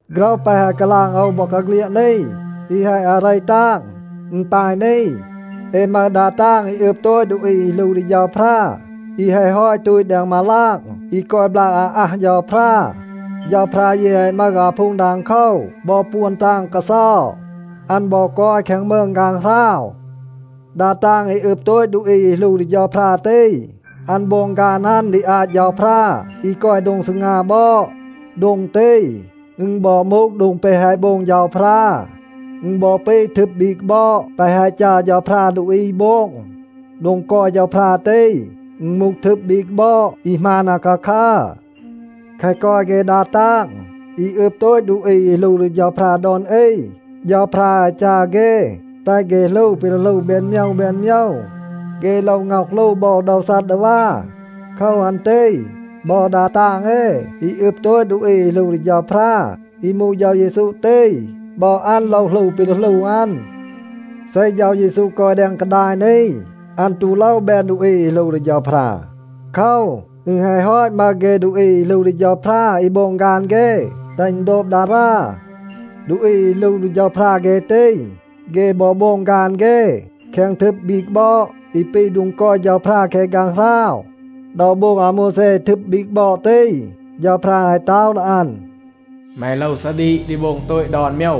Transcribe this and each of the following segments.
โฆรห แปะ แฮะ กาลาง โอว บอกาเฆลียด นี, อี แฮะ อาเร ตาง, อึณ ปาย นี. เอ มึห ดา ตาง อี อึบ โตต ดูอี อี หลู ดี เฌาพรา อี แฮะ ฮอต ตูต แดง มาลาง อี กอย บลาก อาอัห เฌาพรา. เฌาพรา ยี แฮะ มึห อาพูง ดังโคว บอ ปวน ตาง กาเซา. อัน บอ กอย แคง มืง ฆางหราว. ดา ตาง อี อึบ โตต ดูอี อี หลู ดี เฌาพรา ตี, อัน โบง ฆาน อัน ดี อาต เฌาพรา อี กอย โดง ซีงา บอด. โดง ตี, อึณ บอ มูห โดง แปะ แฮะ โบง เฌาพรา. อึณ บอ ปี ทึบ บีก บอด แปะ แฮะ จัร เฌาพรา ดูอี โบง. โดง กอย เฌาพรา ตี, อึณ มูห ทึบ บีก บอด อี หมาน อาคาคัร. แคะ กอย เฆ ดา ตาง อี อึบ โตต ดูอี อี หลู ดี เฌาพรา ดอน อี, เฌาพรา แฮะ จัร เฆ, แตห เฆ หลู ปี ดี หลู แบน โมยว แบน โมยว. เฆ โลว ง็อห หลู บอ โดว ซัดดาวา. โคว อัน ตี บอ ดา ตาง เอ อี อึบ โตต ดูอี อี หลู ดี เฌาพรา อี มูห เฌา เยซู ตี, บอ อัน โลว หลู ปี ดี หลู อัน. เซ เฌา เยซู กอย แดง กาดาย นี, อัน ตู โลว แบน ดูอี อี หลู ดี เฌาพรา. โคว, อึณ แฮะ ฮอต มึห เฆ ดูอี อี หลู ดี เฌาพรา อี โบง ฆาน เฆ, แตห อึณ โดบ ดารา. ดูอี อี หลู ดี เฌาพรา เฆ ตี, เฆ บอ โบง ฆาน เฆ แคง ทึบ บีก บอด อี ปี โดง กอย เฌาพรา แคง ฆางหราว. ดอ โบง อาโมวแซ ทึบ บีก บอด ตี, เฌาพรา แฮะ ต็อห ดี อัน, “แม โลว ซาดีก ดี โบง โตต ดอน โมยว,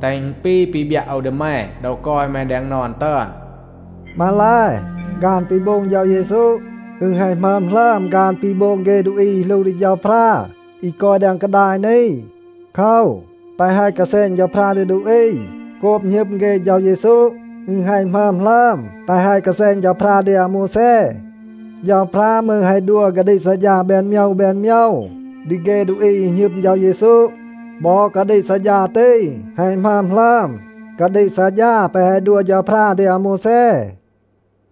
แตห อึณ ปี ปี บยัะ โอว ดี แม ดอ กอย แม แดง นอน ตึอน.” มาแล, ฆาน ปี โบง เฌา เยซู, อึณ แฮะ หมึอม หลึอม ฆาน ปี โบง เฆ ดูอี อี หลู ดี เฌาพรา อี กอย แดง กาดาย นี. โคว, แปะ แฮะ กาแซณ เฌาพรา ดี ดูอี โกบ หณึม เฆ เฌา เยซู, อึณ แฮะ หมึอม หลึอม แปะ แฮะ กาแซณ เฌาพรา ดี อาโมวแซ. เฌาพรา มืร แฮะ ดัว กาดีก ซัดฌา แบน โมยว แบน โมยว ดี เฆ ดูอี อี หณึม เฌา เยซู. บอ กาดีก ซัดฌา ตี, แฮะ หมึอม หลึอม กาดีก ซัดฌา แปะ แฮะ ดัว เฌาพรา ดี อาโมวแซ.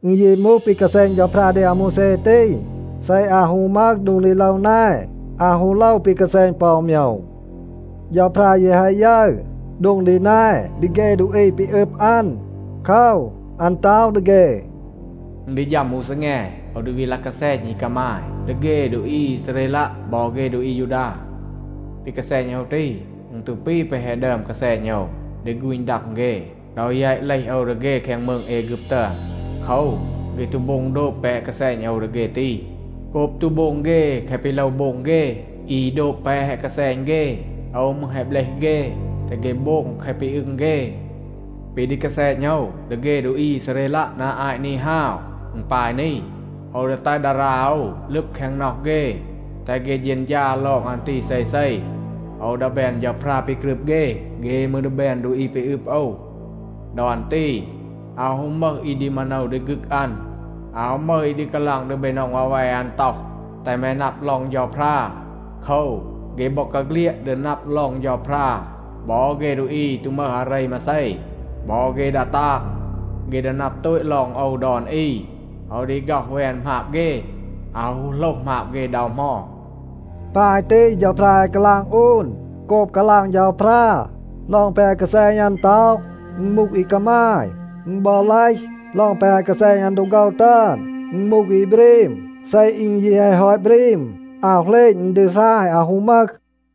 อึณ ยี มูห ปี กาแซณ เฌาพรา ดี อาโมวแซ ตี, เซ อาว ฮู มึห โดง ดี โลว แน, อาว ฮู โลว ปี กาแซณ ปอ อู โมยว. เฌาพรา แยะ แฮะ ยึร โดง ดี แน ดี เฆ ดูอี ปี อึบ อัน. โคว, อัน ต็อห ดี เฆ, “อึณ ดี ฌัม อู ซีแง, โอว ดี วี ลาย กาแซณ อี กามาย ดี เฆ ดูอี อีซาเรลัะ บอ เฆ ดูอี อายูดา. ปี กาแซณ โอว ตี, อึณ ตู ปี แปะ แฮะ ดึอม กาแซณ โอว ดี ฆูณ ดัง เฆ ดอ แยต เลห โอว ดี เฆ แคง มืง แอฆึบ ตึอน. โคว, เฆ ตู โบง โดบ แปะ แฮะ กาแซณ โอว ดี เฆ ตี. โกบ ตู โบง เฆ แคะ ปี โลว โบง เฆ อี โดบ แปะ แฮะ กาแซณ เฆ, โอว มืร แฮะ เบลห เฆ, แตห เฆ โบง แคะ ปี อึง เฆ. ปี ดี กาแซณ โอว ดี เฆ ดูอี อีซาเรลัะ นา อาต นี ฮาว, อึณ ปาย นี. โอว ดี แตห ดารา โอว ลึบ แคง น็อห เฆ, แตห เฆ เฌณฌา ลอง อัน ตี เซเซ. โอว ดี แบน เฌาพรา ปี กรึบ เฆ, เฆ มืร ดี แบน ดูอี ปี อึบ โอว. ดอ อัน ตี อาว ฮู มึห อี ดี มาโนว ดี ฆึก อัน, อาว ฮู มึห อี กาลาง ดี บีนอง วอแว อัน ต็อห, ‘แตห เบ นับ ลอง เฌาพรา.’ โคว, เฆ บอกาเฆลียด ดี นับ ลอง เฌาพรา. บอ เฆ ดูอี อี ตู มึห อาเร มาเซ บอ เฆ ดา ตาง, เฆ ดี นับ โตต ลอง โอว ดอน อี. โอว ดี ฆ็อห แวน หมาบ เฆ, อาว ฮู โหลห หมาบ เฆ ดอ เหมา.” ปาย ตี เฌาพรา แฮะ กาลาง อูน. โกบ กาลาง เฌาพรา ลอง แปะ แฮะ กาแซณ อัน ต็อห, อึณ มูห อี กามาย, อึณ บอ เลห ลอง แปะ แฮะ กาแซณ อัน ดอ โฆว ตึอน, อึณ มูห อี บรีม. เซ อึณ ยี แฮะ ฮอต บรีม, อาว เหลณ อึณ ดี หราย, อาว ฮู มึห.